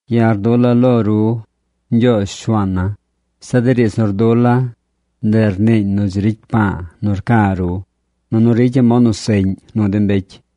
Ya̱ rdula̱ lo ru, Ñgyoozh, Shuaan na. Zeꞌ de riidz nu rdula̱, ndeꞌ rniiñ nu dzi ricy pa̱a̱ nu rca̱ ru, nunu ricya̱ mod nu seꞌñ nu de mbecy.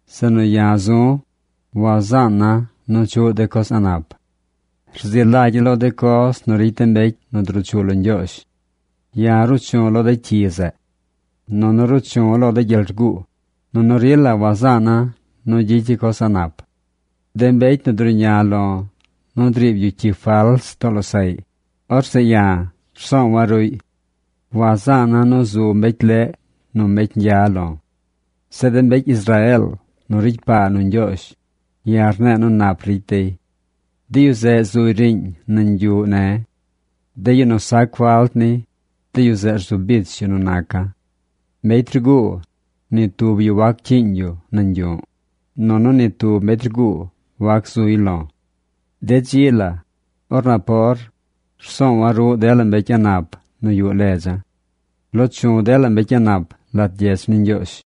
Zeꞌ nu ya̱ zu̱, wazaan na nu chuꞌ de coz a̱ꞌ nap. Rzi lagya̱ lo de coz nu ricy de mbecy nu druu chu lo Ñgyoozh. Ya̱ ruu chu̱ lo de cyi zeꞌ. Nunu ruu chu̱ lo gyel rguu, nunu rila wazaan na nu gyicya̱ coz a̱ꞌ nap. De mbecy nu druꞌña lo̱ nu driib yu cyi fals too losaꞌy, orzeꞌ ya̱ rsoowa̱ ruꞌy. Wazaana̱ nu zu mbecy leꞌ nu mbecy ñgya lo̱. Zeꞌ de mbecy Israeel nu ricy paa nu Ñgyoozh, ya̱ rne̱e̱ nu nap ricy dey. De yu zeꞌ zuy riiñ nañ yuꞌ ne̱. De yu nu sac falt ni, de yu zeꞌ rzu bich yu nu naca̱. Mbecy rguu, ni tub yu wac cyiiñ yu nañ yu̱ꞌ, nunu ni tub mbecy rguu wac zuy lo̱. De dzi la, or napor, rsoowa̱ ruꞌ dela mbecy a̱ꞌ nap nu yuꞌ ledza̱. Loo chu̱ dela mbecy a̱ꞌ nap lat gyedz ni Ñgyoozh.